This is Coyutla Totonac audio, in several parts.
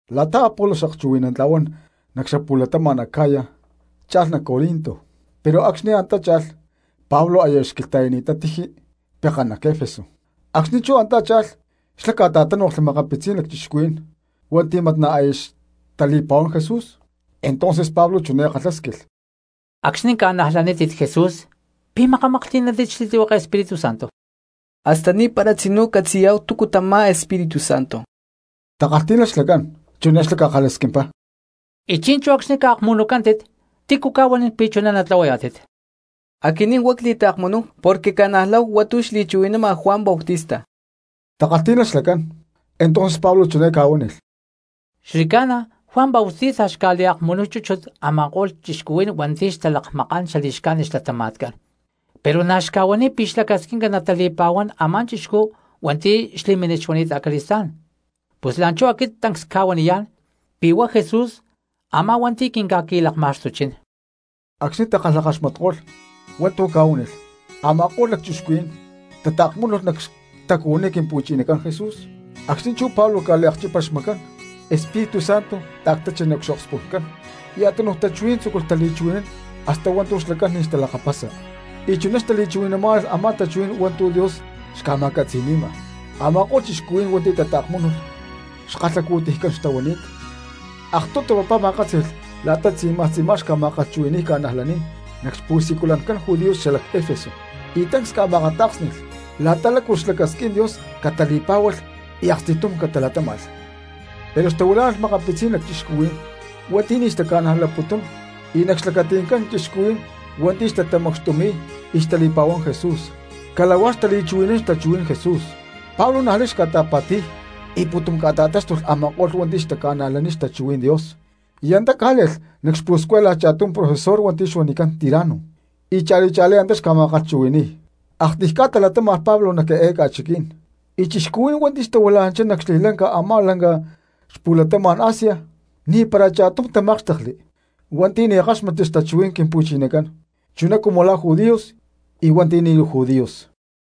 La̠ta Apolos xakchuhui̠nantla̠huán nac xapu̠latama̠n Acaya cha̠lh nac Corinto, pero acxni̠ antá cha̠lh Pablo aya xquilhta̠yani̠ttá tiji pekán nac Efeso. Acxni̠ chú antá cha̠lh xla̠ ca̠ta̠tánoklhli makapitzí̠n lacchixcuhuí̠n hua̠nti̠ mat na̠ aya xtali̠pa̠huán Jesús. Entonces Pablo chiné ca̠kalhásquilh: —Acxni̠ ca̠najlanítit Jesús, ¿pi̠ makamaklhti̠nántit xli̠tlihueke Espíritu Santo? —Hasta ni̠para tzinú ccatzi̠yá̠hu túcu tamá Espíritu Santo —takalhtí̠nalh xlacán. Chiné xlá ca̠kalhasquimpá: —Y chi̠nchú acxni̠ ca̠akmunucántit, ¿tícu ca̠huanín pi̠ chuná natlahuayá̠tit? —Aquinín huá cli̠taakmunúhu porque cca̠najláhu hua̠ntu̠ xli̠chuhui̠nama Juan Bautista —takalhtí̠nalh xlacán. Entonces Pablo chiné ca̠huánilh: —Xli̠ca̠na Juan Bautista xca̠liakmunuy chúchut a̠ma̠ko̠lh cristianos hua̠nti̠ xtalakmakán xali̠xcájnit xlatama̠tcán, pero na̠ xca̠huaniy pi̠ xlacasquinca natali̠pa̠huán a̠má chixcú hua̠nti̠ xli̠mínit xuani̠t acali̠stá̠n. Pus la̠nchú aquit tancs cca̠huaniyá̠n pi̠ huá Jesús a̠má hua̠nti̠ quinca̠qui̠lakma̠xtuchín. Acxni̠ takalhakaxmatko̠lh hua̠ntu̠ ca̠huánilh a̠ma̠ko̠lh lacchixcuhuí̠n tataakmúnulh nac xtacuhuiní Quimpu̠chinacán Jesús. Acxni̠ chú Pablo ca̠liacchípalh xmacán Espíritu Santo ta̠ctachi nac xokspu̠ncán y a̠túnuj tachuhuí̠n tzúculh tali̠chuhui̠nán hasta hua̠ntu̠ xlacán ni̠ xtalakapasa, y chuná xtali̠chuhui̠namá̠nalh a̠má tachuhuí̠n hua̠ntu̠ Dios xca̠ma̠catzi̠ni̠ma. Ama̠ko̠lh cristianos hua̠nti̠ tataakmúnulh xkalhacu̠tiycán xtahuani̠t. Aktutu papá ma̠kátzi̠lh la̠ta tzi̠maj tzi̠má xca̠ma̠kalhchuhui̠ni̠y cristianos nac xpu̠siculancán judíos xalac Efeso y tancs ca̠ma̠akatá̠ksni̠lh la̠ta lácu lacasquín Dios catali̠pá̠hualh y aksti̠tum catalatáma̠lh. Pero xtahuilá̠nalh makapitzí̠n lacchixcuhuí̠n hua̠nti̠ ni̠ taca̠najlapútulh y nac xlacati̠ncán cristianos hua̠nti̠ xtatamacxtumi̠y y xtali̠pa̠huán Jesús cala̠huá xtali̠kalhchuhui̠nán xtachuhuí̠n Jesús. Pablo niaj lay xca̠ta̠pa̠ti̠y y pu̠tum ca̠ta̠táxtulh a̠ma̠ko̠lh hua̠nti̠ xca̠najlanini̠t xtachuhuí̠n Dios y antá cá̠le̠lh nac xpu̠scuela cha̠tum profesor hua̠nti̠ xuanicán Tirano, y cha̠li cha̠lí antá xca̠ma̠kalhchuhui̠ni̠y. Aktiy ca̠ta latáma̠lh Pablo nac eé ca̠chiquí̠n, y cristianos hua̠nti̠ xtahuila̠nanchá nac xli̠ca̠lanca a̠má lanca xapu̠latama̠n Asia ni̠para cha̠tum tamákxtekli hua̠nti̠ ni̠ káxmatli xtachuhuí̠n Quimpu̠chinacán chuná cumu la̠ judíos y hua̠nti̠ ni̠ judíos.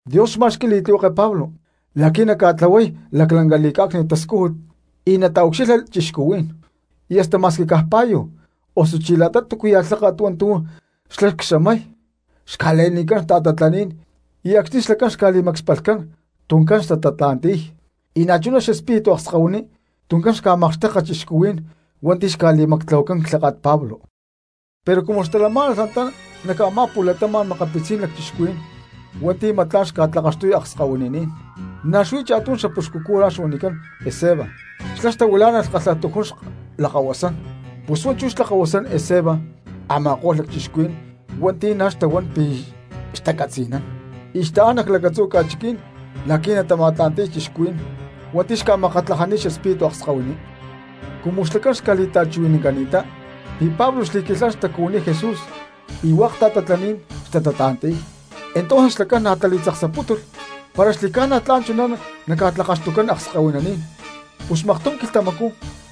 Dios xma̠xqui̠y li̠tlihueke Pablo la̠qui̠ naca̠tlahuay laclanca li̠cá̠cni̠t tascújut y nataucxilha cristianos. Y hasta ma̠squi caj pa̠yu osuchí la̠ta túcuya̠ lháka̠t hua̠ntu̠ xlá xca̠xamay xca̠le̠nicán ta̠tatlaní̠n y acxni̠ xlacán xca̠li̠macspalhcán tuncán xtatatla̠nti̠y; y na̠chuná xespíritu akskahuininí̠n tuncán xca̠makxteka cristianos hua̠nti̠ xca̠li̠tlahuacán clháka̠t Pablo. Pero cumu xtalamá̠nalh antá nac a̠má pu̠latama̠n makapitzí̠n lacchixcuhuí̠n hua̠nti̠ mat tla̠n xca̠tlakaxtuy akskahuininín, na̠ xuí cha̠tum xapuxcu cura xuanicán Esceva xlá xtahuilá̠nalh kalhatujún xlakahuasán, pus huá chú xlakahuasán Esceva a̠ma̠ko̠lh lacchixcuhuí̠n hua̠nti̠ na̠ xtahuán pi̠ xtacatzi̠nán, y xtaán nac lactzu̠ ca̠chiqui̠ní̠n la̠qui̠ natama̠tla̠nti̠y cristianos hua̠nti̠ xca̠makatlajani̠t xespíritu akskahuiní. Cumu xlacán xca̠li̠ta̠chuhui̠nancani̠ttá pi̠ Pablo xli̠quilhán xtacuhuiní Jesús y hua̠k ta̠tatlaní̠n xtatatla̠nti̠y, entonces xlacán na̠ tali̠tzaksapútulh para xli̠ca̠na tla̠n chuná naca̠tlakaxtucán akskahuininí̠n. Pus aktum quilhtamacú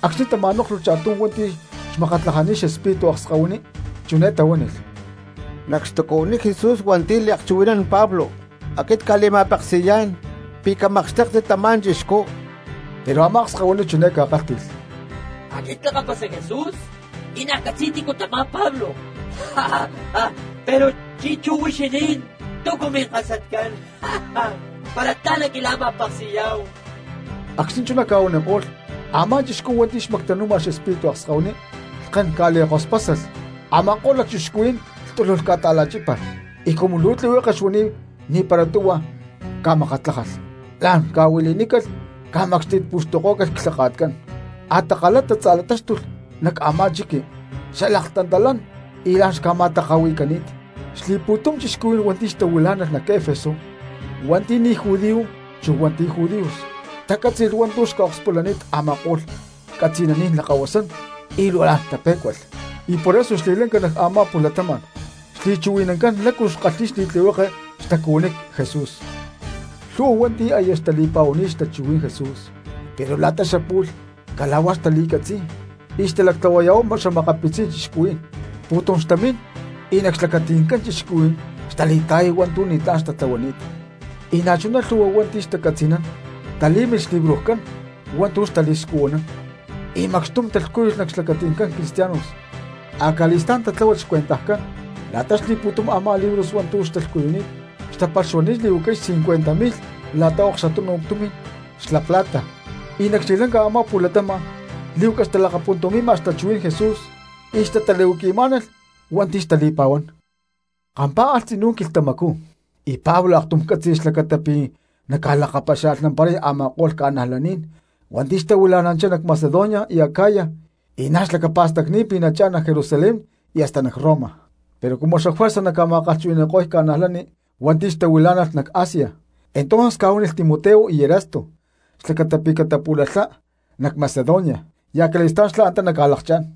acxni̠ tama̠nóklhulh cha̠tum hua̠nti̠ xmakatlajani̠t xespíritu akskahuiní chiné tahuánilh: —¡Nac xtacuhuiní Jesús hua̠nti̠ liakchuhui̠nán Pablo aquinín cca̠li̠ma̠peksi̠yá̠n pi̠ camakxtéktit tamá chixcú! Pero a̠má akskahuiní chiné ca̠kálhti̠lh: —Aquit clakapasa Jesús y na̠ ccatzi̠y tícu tamá Pablo, pero chi̠nchú huixinín, ¿túcu minkasatcán para tla̠n naquila̠ma̠peksi̠yá̠hu? Acxni̠ chuná ca̠huaniko̠lh, a̠má chixcú hua̠nti̠ xmactanu̠ma xespíritu akskahuiní lhken ca̠li̠kospásalh a̠ma̠ko̠lh lacchixcuhuí̠n y lhtuluj ca̠ta̠la̠chípalh, y cumu luu tlihueke xuani̠t ni̠para tuhua ca̠makatlájalh, la̠n ca̠huili̠nícalh, ca̠macxti̠tpu̠xtukó̠calh clhaka̠tcán, a̠takalá tatza̠latáxtulh nac a̠má chiqui xalhtantalán y la̠n xca̠ma̠taka̠hui̠cani̠t. Xli̠pu̠tum cristianos hua̠nti̠ xtahuilá̠nalh nac Efeso hua̠nti̠ ni̠ judíos chu hua̠nti̠ judíos tacátzi̠lh hua̠ntu̠ xca̠akspulani̠t a̠ma̠ko̠lh catzi̠naní̠n lakahuasán y luu la̠n tapé̠cualh, y por eso xli̠ca̠lanca nac a̠má pu̠latama̠n xli̠chuhui̠nancán lácu xkalhi̠y li̠tlihueke xtacuhuiní Jesús. Lhu̠hua hua̠nti̠ aya xtali̠pa̠huani̠t xtachuhuí̠n Jesús pero la̠ta xapu̠lh cala̠huá xtali̠catzi̠y y xtalactlahuaya̠huay xa̠makapitzí̠n cristianos, pu̠tum xtamín y nac xlacati̠ncán cristianos xtali̠ta̠yay hua̠ntu̠ ni̠tlá̠n xtatlahuani̠t. Y na̠chuná lhu̠hua hua̠nti̠ xtacatzi̠nán talí̠milh xlibrojcán hua̠ntu̠ xtali̠scuhuanán y macxtum talhcúyulh nac xlacati̠ncán cristianos. Acali̠stá̠n tatláhualh xcuentajcán la̠ta xli̠pu̠tum a̠má libros hua̠ntu̠ ca̠lhcuyúcalh, xtapalh xuani̠t li̠huacay cincuenta mi̠lh la̠ta xaokxutunu tumi̠n xla plata. Y nac xli̠ca̠lanca a̠má pu̠latama̠n lí̠huaca xtalakapuntumi̠ma xtachuhuí̠n Jesús y xtatali̠huaqui̠má̠nalh hua̠nti̠ xtali̠pa̠huán. Kampá̠alh tzinú quilhtamacú y Pablo aktum cátzi̠lh xlacata pi̠ naca̠lakapaxia̠lhnamparay a̠ma̠ko̠lh ca̠najlaní̠n hua̠nti̠ xtahuilá̠nalh nac Macedonia y Acaya y na̠ xlacapa̠stacni̠t pi̠ nachá̠n nac Jerusalén y hasta nac Roma. Pero cumu xafuerza naca̠ma̠kalhchuhui̠ni̠ko̠y cristianos hua̠nti̠ xtahuilá̠nalh nac Asia, entonces ca̠huánilh Timoteo y Erasto xlacata pi̠ catapu̠lalhá nac Macedonia y acali̠stá̠n xlá antá naca̠lakchá̠n.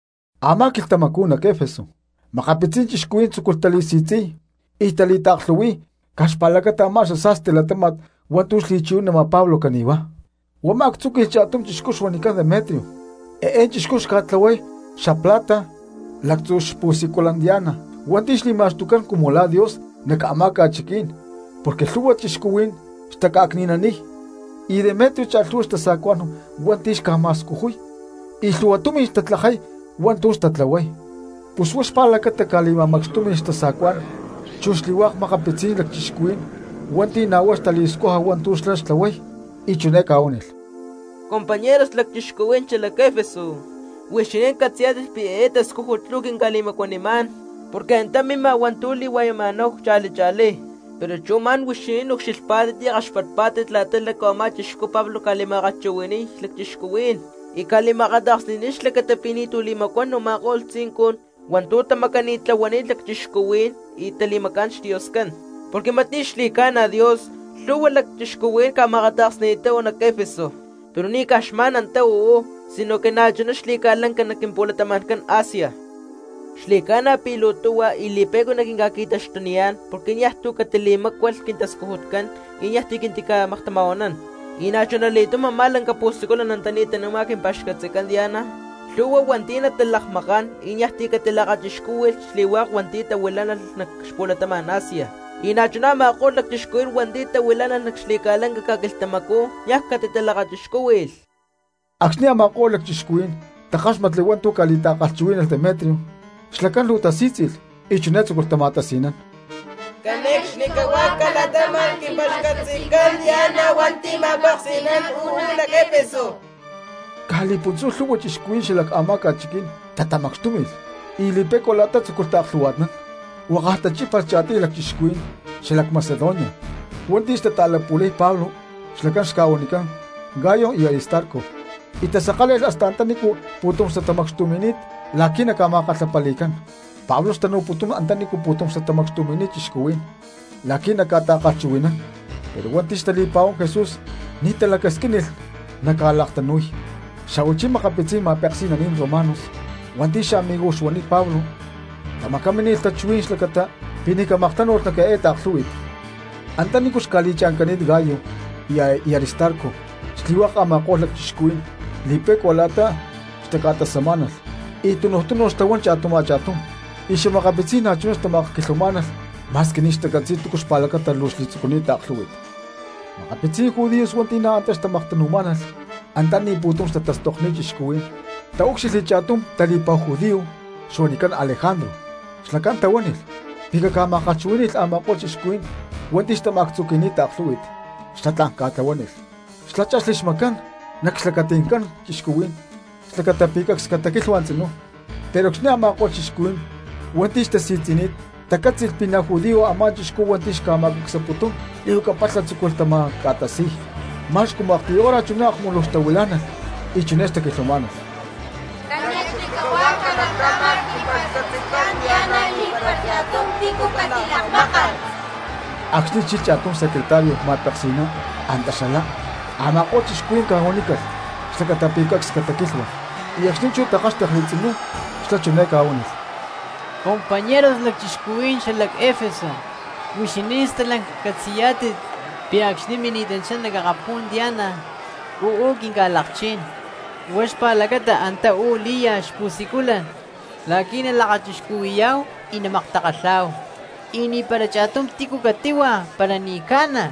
Amá quilhtamacú nac Efeso makapitzí̠n cristianos tzúculh tali̠si̠tzi̠y y tali̠taaklhu̠hui̠y caj xpa̠lacata a̠má xasa̠sti latáma̠t hua̠ntu̠ xli̠chuhui̠nama Pablo cani̠huá. Huá ma̠actzúqui̠lh cha̠tum chixcú xuanicán Demetrio, eé chixcú xca̠tlahuay xla plata lactzu̠ xpu̠siculan Diana hua̠nti̠ xli̠ma̠xtucán cumu la̠ Dios nac a̠má ca̠chiqui̠ní̠n porque lhu̠hua cristianos xtaca̠cni̠naniy; y Demetrio cha̠lhu̠hua xtasa̠cuá̠n hua̠nti̠ xca̠ma̠scujuy y lhu̠hua tumi̠n xtatlajay hua̠ntu̠ xtatlahuay. Pus huá xpa̠lacata ca̠li̠ma̠macxtúmi̠lh xtasa̠cuá̠n chu xli̠hua̠k makapitzí̠n lacchixcuhuí̠n hua̠nti̠ na̠ huá xtali̠scuja hua̠ntu̠ xlá xtlahuay, y chiné ca̠huánilh: —¡Compañeros, lacchixcuhuí̠n xalac Efeso! Huixinín catzi̠yá̠tit pi̠ eé tascújut luu quinca̠li̠macuanimá̠n porque antá mima hua̠ntu̠ li̠hua̠yama̠náhu cha̠li cha̠lí. Pero chú ma̠n huixinín ucxilhpá̠tit y kaxpatpá̠tit la̠ta lácu a̠má chixcú Pablo ca̠li̠ma̠kalhchuhui̠ni̠y cristianos y ca̠li̠ma̠akata̠ksni̠ni̠t xlacata pi̠ ni̠tu̠ li̠macuán a̠ma̠ko̠lh tzincun hua̠ntu̠ tamacani̠tlahuani̠t lacchixcuhuí̠n y tali̠macá̠n xdioscán, porque mat ni̠ xli̠ca̠na Dios; lhu̠hua cristianos ca̠ma̠akata̠ksni̠ni̠ttá uú nac Efeso, pero ni̠ caj xma̠n antá uú sino que na̠chuná xli̠ca̠lanca nac quimpu̠latama̠ncán Asia. Xli̠ca̠na pi̠ luu tuhua y li̠pe̠cua naquinca̠qui̠taxtuniyá̠n porque niaj tu̠ catili̠mácualh quintascujutcán y niaj ti̠ quintica̠maktama̠huanán, y na̠chuna li̠túm a̠má lanca pu̠siculan antaní tanu̠ma quimpa̠xcatzican Diana lhu̠hua hua̠nti̠ natalakmakán y niaj ti̠ catilakachixcúhui̠lh xli̠hua̠k hua̠nti̠ tahuilá̠nalh nac xapu̠latama̠n Asia, y na̠chuná a̠ma̠ko̠lh cristianos hua̠nti̠ tahuilá̠nalh nac xli̠ca̠lanca ca̠quilhtamacú niaj catitalakachixcúhui̠lh. Acxni̠ a̠ma̠ko̠lh lacchixcuhuí̠n takáxmatli hua̠ntu̠ ca̠li̠ta̠kalhchuhuí̠nalh Demetrio xlacán luu tasí̠tzi̠lh y chiné tzúculh tama̠tasi̠nán: —¡Cane̠cxnicahuá calatáma̠lh quimpa̠xcatzican Diana hua̠nti̠ ma̠peksi̠nán uú nac Efeso! Caj li̠puntzú lhu̠hua cristianos xala a̠má ca̠chiquí̠n tatamacxtúmi̠lh y li̠pe̠cua la̠ta tzúculh taaklhu̠hua̠tnán, huakaj tachípalh cha̠tiy lacchixcuhuí̠n xalac Macedonia hua̠nti̠ xtata̠lapu̠lay Pablo xlacán xca̠huanicán Gayo y Aristarco, y tasakále̠lh hasta antanícu pu̠tum xtatamacxtumi̠ni̠t la̠qui̠ naca̠ma̠kalhapali̠cán. Pablo xtanu̠putún antaní pu̠tum xtatamacxtumi̠ni̠t cristianos la̠qui̠ naca̠ta̠kalhchuhui̠nán pero hua̠nti̠ xtali̠pa̠huán Jesús ni̠ talacasquínilh naca̠laktanúy. Xa̠huachí makapitzí̠n ma̠peksi̠naní̠n romanos hua̠nti̠ xamigos xtahuani̠t Pablo tamacamínilh tachuhuí̠n xlacata pi̠ ni̠ camaktánu̠lh nac eé ta̠klhú̠hui̠t. Antanícu xca̠li̠cha̠ncani̠t Gayo y Aristarco xli̠hua̠k a̠ma̠ko̠lh lacchixcuhuí̠n li̠pe̠cua la̠ta xtaca̠tasamá̠nalh y tunuj túnu xtahuán cha̠tum cha̠túm, y makapitzí̠n na̠chuná xtamakquilhuamá̠nalh ma̠squi ni̠ xtacatzi̠y túcu xpa̠lacata luu xli̠tzucuni̠t taaklhú̠hui̠t. Makapitzí̠n judíos hua̠nti̠ na̠ antá xtamaktanu̠má̠nalh antaní pu̠tum xtatastokni̠t cristianos taúcxilhli cha̠tum tali̠pa̠hu judío xuanicán Alejandro, xlacán tahuánilh pi̠ caca̠ma̠kalhchuhuí̠ni̠lh a̠ma̠ko̠lh cristianos hua̠nti̠ xtama̠actzuqui̠ni̠t taaklhú̠hui̠t, xlá tla̠n ca̠tlahuánilh. Xlá chexli xmacán nac xlacati̠ncán cristianos xlacata pi̠ cacs cataquilhua tzinú. Pero acxni̠ a̠ma̠ko̠lh cristianos hua̠nti̠ xtasi̠tzi̠ni̠t tacátzi̠lh pi̠ na̠ judío a̠má chixcú hua̠nti̠ xca̠ma̠cacsaputún li̠huaca palha tzúculh tama̠ca̠tasi̠y, ma̠x cumu aktiy hora chuná akmuluj xtahuilá̠nalh y chiné xtaquilhuamá̠nalh: —¡Cane̠cxnicahuá calatáma̠lh quimpa̠xcatzican Diana y ni̠para cha̠tum tícu catilakmákalh! Acxni̠ chilh cha̠tum csecretario ma̠peksi̠ná antá xalá, a̠ma̠ko̠lh cristianos ca̠huanícalh xlacata pi̠ cacs cataquilhua; y acxni̠ chú takálhxtekli tzinú xlá chiné ca̠huánilh: —Compañeros lacchixcuhuí̠n xalac Efeso, huixinín stalanca catzi̠yá̠tit pi̠ acxni̠ mini̠tanchá nac akapú̠n Diana uú quinca̠lakchín, huá xpa̠lacata antá uú lí̠ya xpu̠siculan la̠qui̠ nalakachixcuhui̠yá̠hu y namaktakalhá̠hu. Y ni̠para cha̠tum tícu catíhua para ni̠ ca̠na.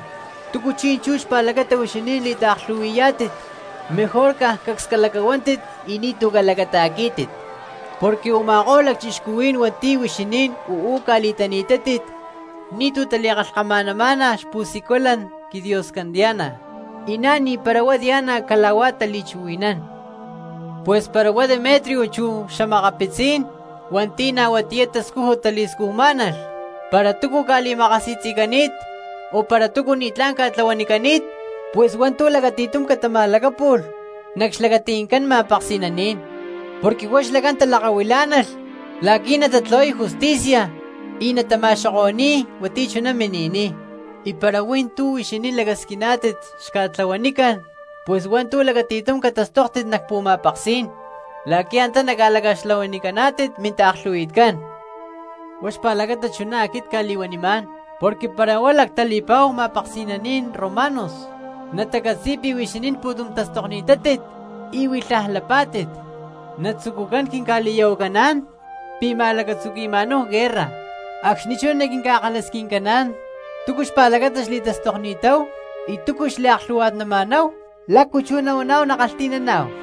¿Túcu chi̠nchú xpa̠lacata huixinín li̠taaklhu̠hui̠yá̠tit? Mejor caj cacs calacahuántit y ni̠tu̠ calacata̠quí̠tit. Porque u̠ma̠ko̠lh lacchixcuhuí̠n hua̠nti̠ huixinín uú ca̠li̠tani̠tátit ni̠tu̠ tali̠kalhkama̠namá̠nalh xpu̠siculan quidioscán Diana y na̠ ni̠para huá Diana cala̠huá tali̠chuhui̠nán. Pus para huá Demetrio chu xa̠makapitzí̠n hua̠nti̠ na̠ huatiyá tascújut tali̠scujmá̠nalh para túcu ca̠li̠makasi̠tzi̠cani̠t o para túcu ni̠tlá̠n ca̠tlahuanicani̠t, pus hua̠ntu̠ lacati̠tum catama̠lacápu̠lh nac xlacati̠ncán ma̠peksi̠naní̠n porque huá xlacán talakahuilá̠nalh la̠qui̠ natatlahuay justicia y natama̠xoko̠ni̠y hua̠nti̠ chuná mini̠niy. Y para hui̠ntú huixinín lacasquiná̠tit xca̠tlahuanicán, pus hua̠ntu̠ lacati̠tum catastóktit nac pu̠ma̠peksí̠n la̠qui̠ antá naca̠laca̠xtlahuanicaná̠tit mintaaklhu̠hui̠tcán. Huá xpa̠lacata chuná aquit cca̠li̠huanimá̠n, porque para huá lactali̠pa̠hu ma̠peksi̠naní̠n romanos natacatzi̠y pi̠ huixinín pu̠tum tastokni̠tátit y huilhaj lapá̠tit natzucucaná̠n quinca̠li̠ya̠huacaná̠n pi̠ ma̠lacatzuqui̠ma̠náhu guerra, acxni̠ chú naquinca̠kalhasquincaná̠n túcu xpa̠lacata xli̠tastokni̠táhu y túcu xliaklhu̠hua̠tnama̠náhu, ¿lácu chú nahuaná̠hu nakalhti̠naná̠hu?